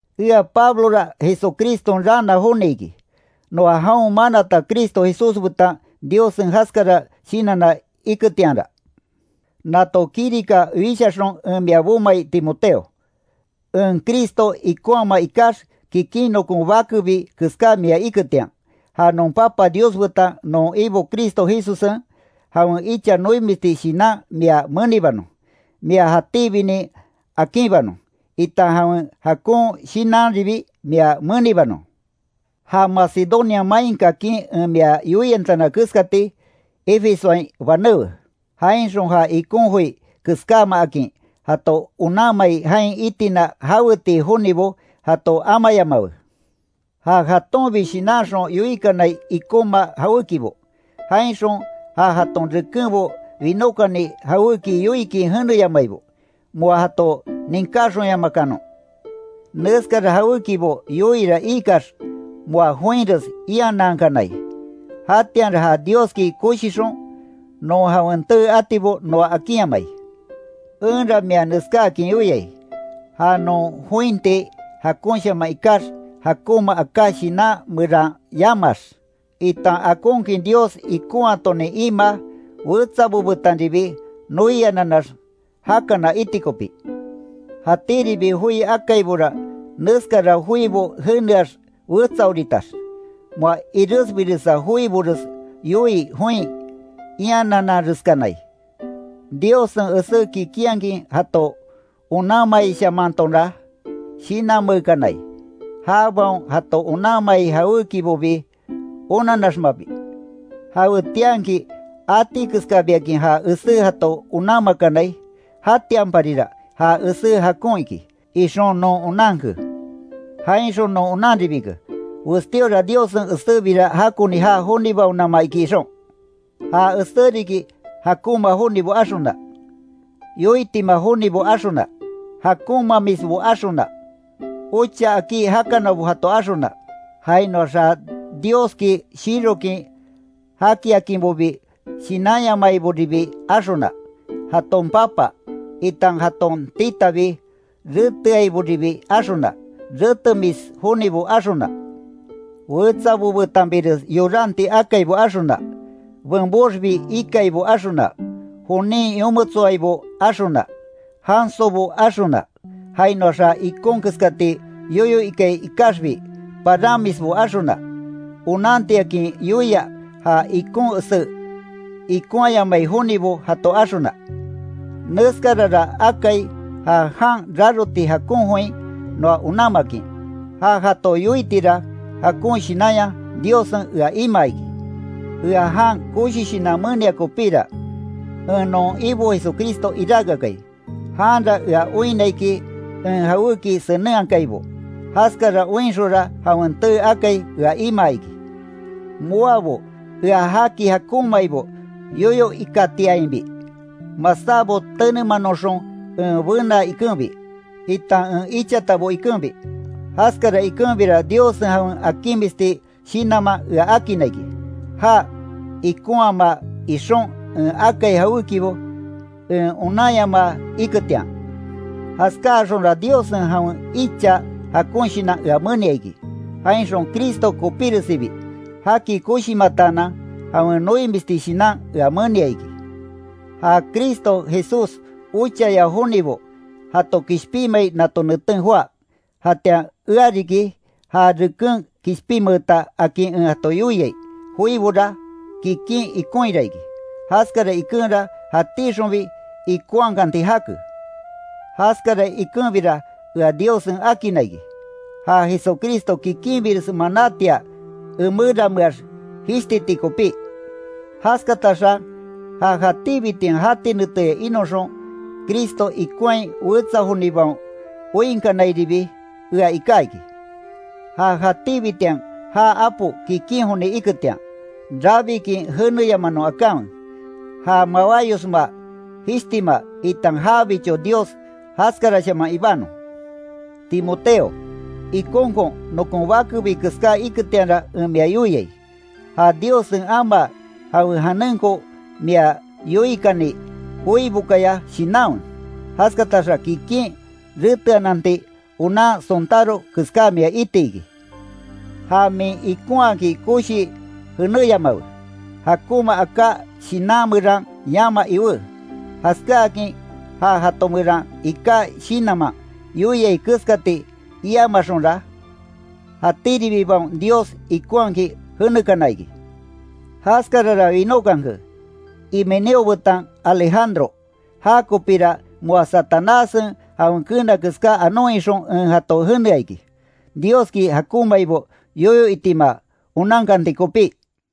Ea Pablora Jesucriston raana joni iki, noa jaon manata Cristo Jesús betan Diossen jaskara shinanna iketianra, nato kirika wishaxon en mia bomai Timoteo, en Cristo ikonhamaa ikax, kikin nokon bakebi keská mia iketian, ja non Papa Dios betan non Ibo Cristo Jesussen, jawen icha noimisti shinan mia menibanon, mia jatíbinin akinbanon, itan jawen jakon shinanribi mia menibanon. Ja Macedonia main kakin en mia yoiantana keskati, Efesoain banéwe, jainxon ja ikon joi keskámaakin jato onanmai jain itina jawetii jonibo jato amayamawe, ja jatonbi shinanxon yoikanai ikoma jawékibo, jainxon ja jaton rekenbo winókani jawéki yoikin jeneyamaibo, moa jato ninkáxonyamakanon. Neskara jawékibo yoiira iikax moa joinres ianankanai, jatianra ja Dioski koshixon non jawen tee atibo noa akinyamai. Enra mia neskáakin yoiai, ja non jointi jakonshaman ikax jakonma aká shinan meran yamaax, itan akonkin Dios ikonhatonin imaa, wetsabo betanribi noiananax jakana iti kopí. Jatíribi joi akaibora neskara joibo jeneax wetsaoritax, moa iresbiresa joibores yoii join ianananreskanai. Diossen esé kikinhakin jato onanmaishamantonra shinanmeekanai, jabaon jato onanmai jawékibobi onanaxmabi. Jawetianki atikeskabiakin ja esé jato onanmakanai, jatianparira ja esé jakon iki ixon non onanke. Jainxon non onanribike, westíora Diossen esébira jakoni jaa jonibaonama iki ixon. Ja esé riki jakonma jonibo axona, yoitima jonibo axona, jakonmamisbo axona, ocha akí jakanabo jato axona, jainoax ja Dioski shirokin jakiakinbobi shinanyamaiboribi axona, jaton papa, itan jaton titabi reteaiboribi axona, retemis jonibo axona, wetsabo betanbires yoranti akaibo axona, benboxbi ikaibo axona, jonin yometsoaibo axona, jansobo axona, jainoax ja ikon keskati yoyo ikai ikaxbi paranmisbo axona, onantiakin yoia ja ikon esé ikonhayamai jonibo jato axona, Neskarara akai ja jan raroti jakon join noa onanmakin, ja jato yoitira jakon shinanya Diossen ea imaa iki. Ea jan koshi shinan menia kopíra, en non Ibo Jesucristo iráke akai, janra ea oinna iki en jawéki senenhakaibo, jaskara oinxonra jawen tee akai ea imaa iki. Moabo ea jaki jakonmaibo yoyo ikatiainbi, masábo tenemanoxon en benaa ikenbi, itan en ichatabo ikenbi. Jaskara ikenbira Diossen jawen akinmisti shinanman ea akinna iki, já ikonhaama ixon en akai jawékibo en onanyamaa iketian. Jaskáaxonra Diossen jawen icha jakon shinan ea menia iki, jainxon Cristo kopíresibi, jaki koshimataanan jawen noimisti shinan ea menia iki. Ja Cristo Jesús ochaya jonibo jato kishpinmai nato neten joá, jatian ea riki ja reken kishpinmeeta akin en jato yoiai joibora, kikin ikonhira iki, jaskara ikenra jatíxonbi ikonhakanti jake. Jaskara ikenbira ea Diossen akinna iki, ja Jesucristo kikinbires manátia emerameax jishtiti kopí. Jaskataxa ja jatíbitian jati neteya inoxon Cristo ikonhai wetsa jonibaon oinkanairibi ea iká iki. Ja jatíbitian jaa Apo kikin joni iketian, rabikin jeneyamanon akanwe, ja mawáyosma, jishtima, itan jabicho Dios jaskarashaman ibanon. Timoteo, ikonkon nokon bakebi keská iketianra en mia yoiai, ja Diossen amaa jawen janenko mia yoikani joibokaya shinanwe, jaskataxa kikin reteananti onan sontáro keská mia itiki. Ja min ikonhaaki koshii jenéyamawe, jakonma aká shinan meran yama iwé; jaskáakin ja jato meran iká shinanman yoiai keskati iamaxonra, jatíribibaon Dios ikonhakin jenekana iki. Jaskarara winókanke, Himeneo betan Alejandro, jakopira moa Satanássen jawen keena keská anon ixon en jato jenea iki, Dioski jakonmaibo yoyo itima onankanti kopí.